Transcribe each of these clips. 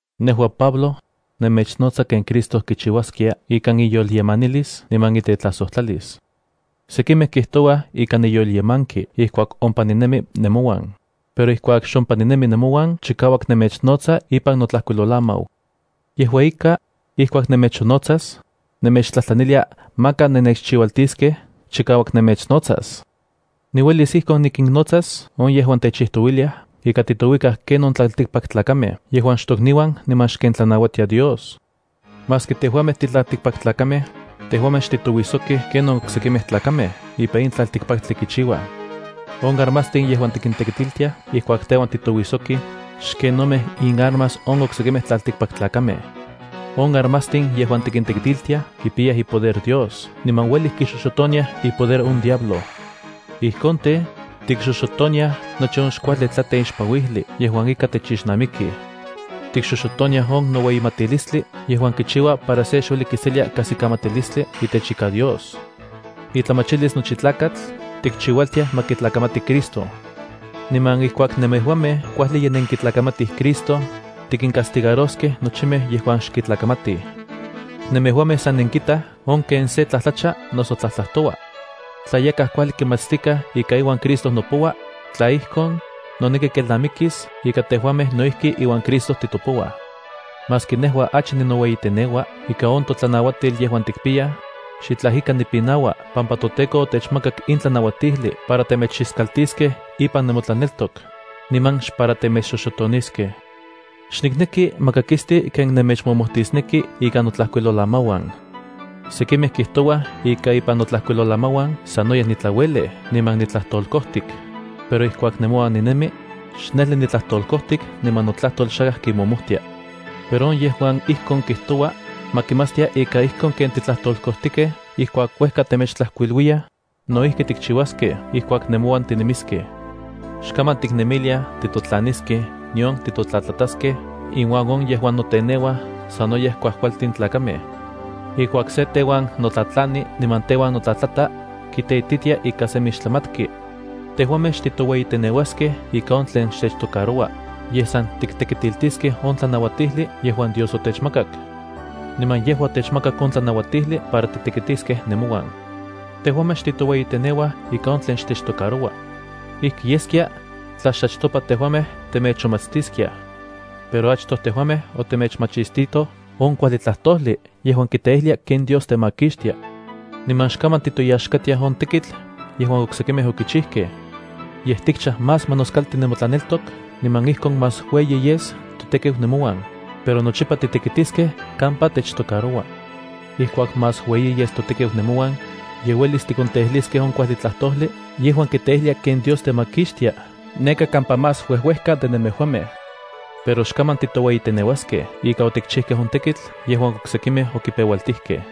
Nejua, Pablo, nemechnotsa ken Cristo kichiuaskia ikan iyolyemanilis niman itetlajsojtlalis. Sekimej kijtouaj ika niyolyemanki ijkuak ompa ninemi nemouan, pero ijkuak xompa ninemi nemouan chikauak nemechnotsa ipan notlajkuilolamau. Yejua ika, ijkuak nemechonnotsas, nemechtlajtlanilia maka nennechchiualtiskej chikauak nemechnotsas. Niuelis ijkon nikinnotsas on yejuan techijtouiliaj ika titouikaj ken on tlaltikpaktlakamej yejuan xtokniuan niman xken tlanauatia Dios. Maski tejuamej titlaltikpaktlakamej, tejuamej xtitouijsokij ken on oksekimej tlakamej ipan in tlaltikpaktli kichiuaj. On armastin yejuan tikintekitiltiaj ijkuak teuan titouijsokij xkenomej inarmas on oksekimej tlaltikpaktlakamej. On armastin yejuan tikintekitiltiaj kipiyaj ipoder Dios niman ueli kixoxotoniaj ipoder on diablo. Ijkon tej, tikxoxotoniaj nochi on xkuajli tlateixpanuijli yejuan ika techixnamikij. Tikxoxotoniaj on noueyimatilistli yejuan kichiua para se xueli kiselia kajsikamatilistli itech ika Dios. Intlamachilistli nochi tlakatl tikchiualtiaj ma kitlakamati Cristo. Niman ijkuak nemejuamej kuajli ye nenkitlakamatij Cristo, tikincastigaroskej nochimej yejuan xkitlakamatij. Nemejuamej san nenkitaj on ken se tlajtlacha noso tlajtlajtoua. Tla yakaj kuajli kimatstikaj ika iuan Cristo nopoua, tla ijkon, noneki kelnamikis ika tejuamej no ijki iuan Cristo titopouaj. Maski nejua achi ninoueyiteneua ika on totlanauatil yejuan tikpiyaj, xitlaj ika nipinaua pampa toTEKO otechmakak in tlanauatijli para temechiskaltiskej ipan nemotlaneltok, niman xpara temechxoxotoniskej. Xnikneki ma kakisti ken nemechmomojtisneki ikan notlajkuilolamauan. Sekimej kijtouaj ika ipan notlajkuilolamauan sanoyej nitlauelej niman nitlajtolkojtik, pero ijkuak nemouan ninemi, xnejli nitlajtolkojtik niman notlajtol xakaj kimojmojtia. Pero on yejuan ijkon kijtoua, ma kimatstia ika ijkon ken titlajtolkojtikej ijkuak uejka temechtlajkuiluiyaj, no ijki tikchiuaskej ijkuak nemouan tinemiskej. Xkaman tiknemiliaj titotlaniskej nion titotlatlataskej inuan on yejuan noteneuaj sanoyej kuajkualtin tlakamej. Ijkuak se teuan notlatlani niman teuan notlatlata kiteititia ika semi xtlamatki. Tejuamej xtitoueyiteneuaskej ika on tlen xtechtocaroua, yej san tiktekitiltiskej on tlanauatijli yejuan Dios otechmakak. Niman yejua otechmakak on tlanauatijli para titekitiskej nemouan. Tejuamej xtitoueyiteneuaj ika on tlen xtechtocaroua. Ijki yeskia tla xachtopa tejuamej temechonmachtiskiaj. Pero tejuamej achtoj otemechmachistitoj on kuajli tlajtojli yejuan kiteijlia ken Dios temakixtia. Niman xkaman tiktoyaxkatiaj on tekitl yejuan oksekimej yokichijkej. Yej titlamachaj más ma noskalti nemotlaneltok niman ijkon más ueyi yes totekiu nemouan, pero nochipa titekitiskej kampa techtocaroua. Ijkuak más ueyi yes totekiu nemouan, ye uelis tikonteijliskej on kuajli tlajtojli yejuan kiteijlia ken Dios temakixtia neka kampa más uejuejka de nemejuamej. Pero xkaman titoueyiteneuaskej ika otikchijkej on tekitl yejuan oksekimej yokipeualtijkej.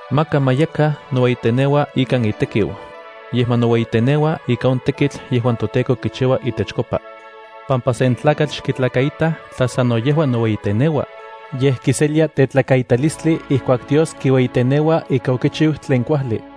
Maka ma yakaj noueyiteneua ikan itekiu, yej ma noueyiteneua ika on tekitl yejuan toTEKO kichiua itechkopa. Ijkon xchiuakan, pampa sen tlakatl xkitlakaitaj tla sano yejua noueyiteneua, yej kiselia tekaitalistli ijkuak Dios kiueyiteneua ika okichiu tlen kuajli.